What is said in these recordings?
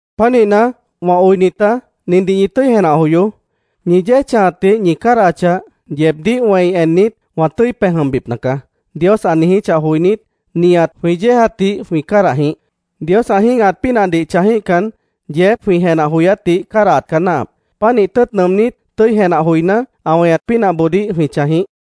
Pánihna, wã oinitá, nindih ñi tʉ́i jenah joyoó: “Ñi yéej chãjatdih ñi cádahachah, yeebdíh wẽi ennit, wã tʉ́i pej jʉmbipna caá”, Dios ã niijíchah joinít, nihat jwĩ yéejatdih jwĩ cádah jĩíh. Dios ã jĩ́gahat pínahdih chãjíhcan, yeejép jwĩ jenah joyátdih cádahat caá náahap. Pánih tʉ́ʉt nʉʉmnít, tʉ́i jenah joiná, ã weñat pínahboodíh jwĩ chãj jĩíh.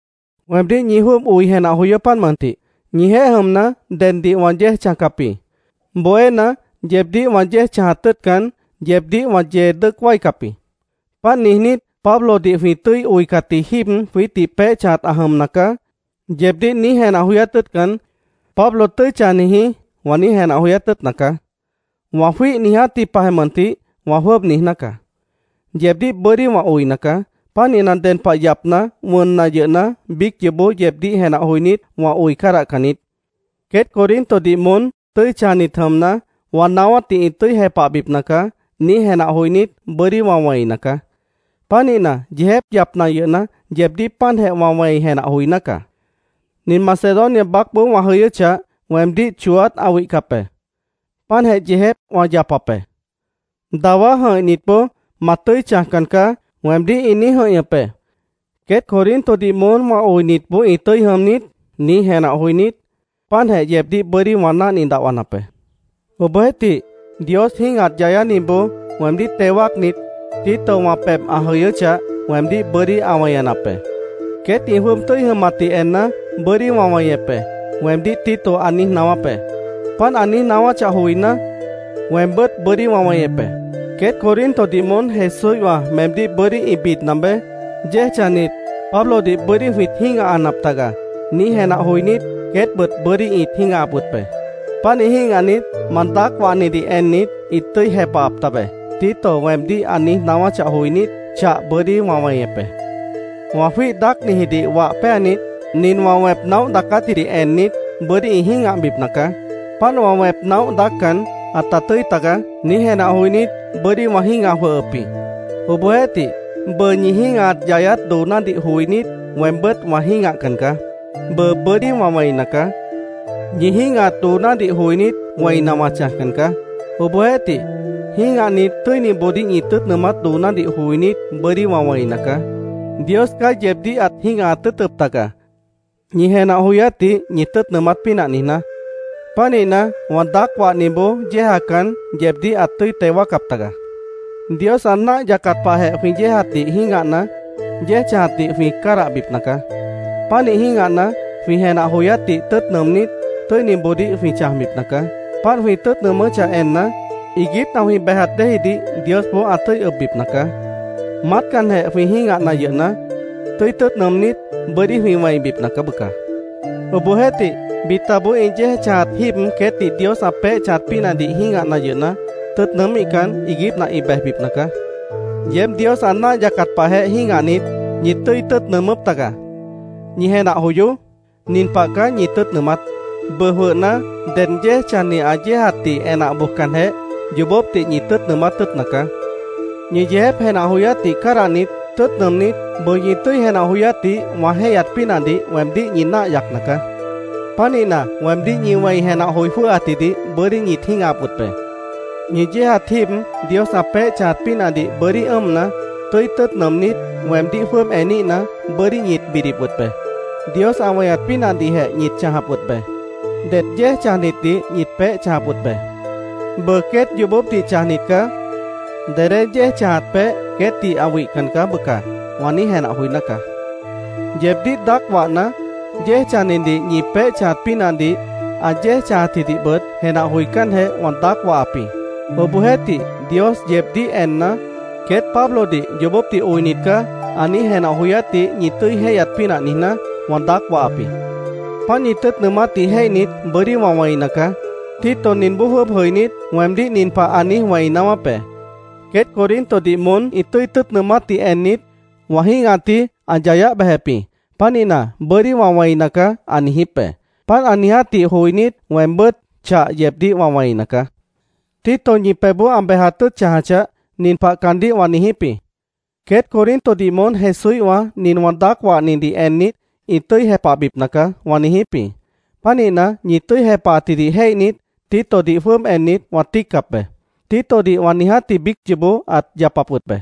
Weemdíh ñi jwʉ́ʉb oi jenah joyoó, páant mʉntih. Ñijeéh jʉmna, deddih wã yéej chãjcap jĩ. Bohéna, yeebdíh wã yéej chãjat tʉ́ʉtcan, yeebdíh wã yee dʉ́ʉc wáicap jĩ. Páant niijnít, “Pablodih jwĩ tʉ́i oicatji jíib jwiítdih peéh chãjat ã jʉmna caá”, yeebdíh niíj jenah joyát tʉ́ʉtcan, “Pablo tʉ́i chãjni jĩí”, wã niíj jenah joyát tʉ́ʉtna caá. Wã jwíih niijátji pahjeh mʉntih, wã jwʉ́ʉb niijná caá: Yeebdíh bʉ́dí wã oina caá. Pánihna, ded pah yapna, wʉnna yʉhna, biíc yoobó yeebdíh jenah joinít, wã oi cádahcan niít. “Queét Corintodih moón tʉ́i chãjnit jʉmna, wã naáwátdih ĩ tʉ́i jepahbipna caá”, niíj jenah joinít, bʉ́dí wã wẽina caá. Pánihna, yeejép yapna yʉhna, yeebdíh páantjeh wã wẽi jenah joiná caá. Nin Macedonia baácboó wã jʉyʉ́chah, weemdíh chooát ã wihcap be. Páantjeh yeejép wã yapap be. Dawá jʉ̃ihnitboó “Ma tʉ́i chãjcan caá”, weemdíh ĩ niíj jʉ̃ihñʉp be. “¿Queét Corintodih moón wã oinitboó ĩ tʉ́i jʉm niít?” niíj jenah joinít, páantjeh yeebdíh bʉ́dí wã náhni dahwanap be. Obohjeéhtih, Dios jĩ́gahat yayániboó weemdíh teo wáacnit, Tito wã pebh ã jʉyʉ́chah, weemdíh bʉ́dí ã weñanap be. “Queét ĩ jwʉ́ʉb tʉ́i jʉmatdih enna, bʉ́dí wã weñep be”, weemdíh Tito ã niíj naáwáp be. Páant ã niíj naáwáchah joiná, weembʉ́t bʉ́dí wã weñep be. “Queét Corintodih moón Jesúíhwã meemdíh bʉ́dí ĩ bidna beé. ‘Yéej chãjnit, Pablodih bʉ́dí jwĩt jĩ́gahanap taga’, niíj jenah joinít, queétbʉt bʉ́dí ĩt jĩ́gahap wʉt be. Pánih jĩ́gahnit, ma daác wahnidih ennit, ĩt tʉ́i jepahap tabe”, Tito weemdíh ã niíj naáwáchah joinít, chah bʉ́dí wã weñep be. Wã jwíih daácnijidih wah péanit, “Nin wã wẽp naóh daacátjidih ennit, bʉ́dí ĩ jĩ́gahbipna caá. Páant wã wẽp naóh daáccan, ãta tʉ́i taga”, niíj jenah joinít, bʉ́dí wã jĩ́gah jwʉhʉp jĩ. Obohjeéhtih, bʉʉ ñi jĩ́gahat yayát doonádih joinít, weembʉ́t wã jĩ́gahcan caá. Bʉʉ bʉ́dí wã wẽina caá. Ñi jĩ́gahat doonádih joinít, wẽina wã chãjcan caá. Obohjeéhtih, jĩ́gahnit, tʉ́iniboodíh ñi tʉ́ʉt nʉʉmát doonádih joinít, bʉ́dí wã wẽina caá. Dios caá yeebdíh ãt jĩ́gahat tʉ́ʉtʉp taga, ñi jenah joyátdih ñi tʉ́ʉt nʉʉmát pínah niijná. Pánihna, wã daác wahniboó yéejacan, yeebdíh ãt tʉ́i teo wáacap taga. Dios ã náah yacat pahjeh jwĩ yéejatdih jĩ́gahna, yéej chãjatdih jwĩ cádahbipna caá. Pánih jĩ́gahna, jwĩ jenah joyátdih tʉ́ʉt nʉʉmnít, tʉ́iniboodíh jwĩ chãjbipna caá. Páant jwĩ tʉ́ʉt nʉʉmʉ́chah enna, iiguípna jwĩ bejat déejidih Diosboó ã tʉ́i ʉbbipna caá. Maátcanjeh jwĩ jĩ́gahna yʉhna, tʉ́i tʉ́ʉt nʉʉmnít, bʉ́dí jwĩ wẽibipna caá, bʉca. Obohjeéhtih, bitaboó ĩ yéej chãjat jíib queétdih Dios ã peéh chãjat pínahdih jĩ́gahna yʉhna, tʉ́ʉt nʉʉ́míhcan, iiguípna ĩ bejbipna caá. Yeéb Dios ã náah yacat pahjeh jĩ́gahnit, ñit tʉ́i tʉ́ʉt nʉʉmʉ́p taga. ¡Ñi jenah joyoó! Nin pah caá ñi tʉ́ʉt nʉʉmát: Bʉʉ jwʉhna, ded yéej chãjni ã yéejatdih enah bojcanjeh, yoobópdih ñi tʉ́ʉt nʉʉmát tʉ́ʉtna caá. Ñi yeejép jenah joyátjidih cádahnit, tʉ́ʉt nʉʉmnít, bʉʉ ñi tʉ́i jenah joyátdih wã jéihyat pínahdih weemdíh ñi náah yacna caá. Pánihna, weemdíh ñi wẽi jenah joi jwʉ́hcatjidih bʉ́dí ñit jĩ́gahap wʉt be. Ñi yéejat jíib Dios ã peéh chãjat pínahdih bʉ́dí ʉ́ʉmna, tʉ́i tʉ́ʉt nʉʉmnít, weemdíh jwʉ́ʉb eníhna, bʉ́dí ñit bidip wʉt be. Dios ã weñat pínahdihjeh ñit chãjap wʉt be. Det yéej chãjnitdih ñit peéh chãjap wʉt be. “Bʉʉ, queét yoobópdih chãjnit caá. Dedé yéej chãjat peéh queétdih ã wihcan caá, bʉca”, wã niíj jenah joiná caá. Yeebdíh daác wahna, yéej chãjnidih ñi peéh chãjat pínahdih, ã yéej chãjatjidihbʉt jenah joicánjeh wã daác wahap jĩ. Obohjeéhtih, Dios yeebdíh enna, “Queét Pablodih yoobópdih oinit caá”, ã niíj jenah joyátdih ñi tʉ́i jéihyat pínah niijná, wã daác wahap jĩ. Páant ñi tʉ́ʉt nʉʉmátdih jéihnit, bʉ́dí wã wẽina caá. Tito ninboó jwʉ́ʉb jʉinít, weemdíh nin pah ã niíj wẽi naáwáp be: “Queét Corintodih moón ĩ tʉ́i tʉ́ʉt nʉʉmátdih ennit, wã jĩ́gahatji ã yayáh bejep jĩ. Pánihna, bʉ́dí wã wẽina caá”, ã niijíp be. Páant ã niijátdih joinít, weembʉ́t chah yeebdíh wã wẽina caá. Tito ñi pebhboó ã bejat tʉ́ʉt chãjachah, nin pah caandíh wã niijíp jĩ: “Queét Corintodih moón Jesúíhwã nin wã daác wahnidih ennit, ĩ tʉ́i jepahbipna caá”, wã niijíp jĩ. Pánihna, ñi tʉ́i jepahatjidih jéihnit, Titodih jwʉ́ʉb ennit, wã tíiccap be. Titodih wã niijátji biíc yoobó ãt yapap wʉt be.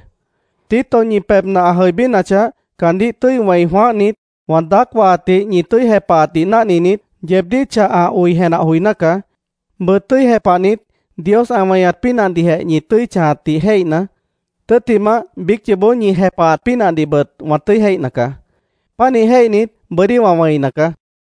Tito ñi pebhna ã jʉibínachah, caandíh tʉ́i wẽi jwãáhnit, wã daác wahatdih ñi tʉ́i jepahatdih náhninit, yeebdíh chah ã oi jenah joiná caá. Bʉʉ tʉ́i jepahnit, Dios ã weñat pínahdihjeh ñi tʉ́i chãjatdih jéihna, tʉ́ttimah biíc yoobó ñi jepahat pínahdihbʉt wã tʉ́i jéihna caá. Pánih jéihnit, bʉ́dí wã wẽina caá.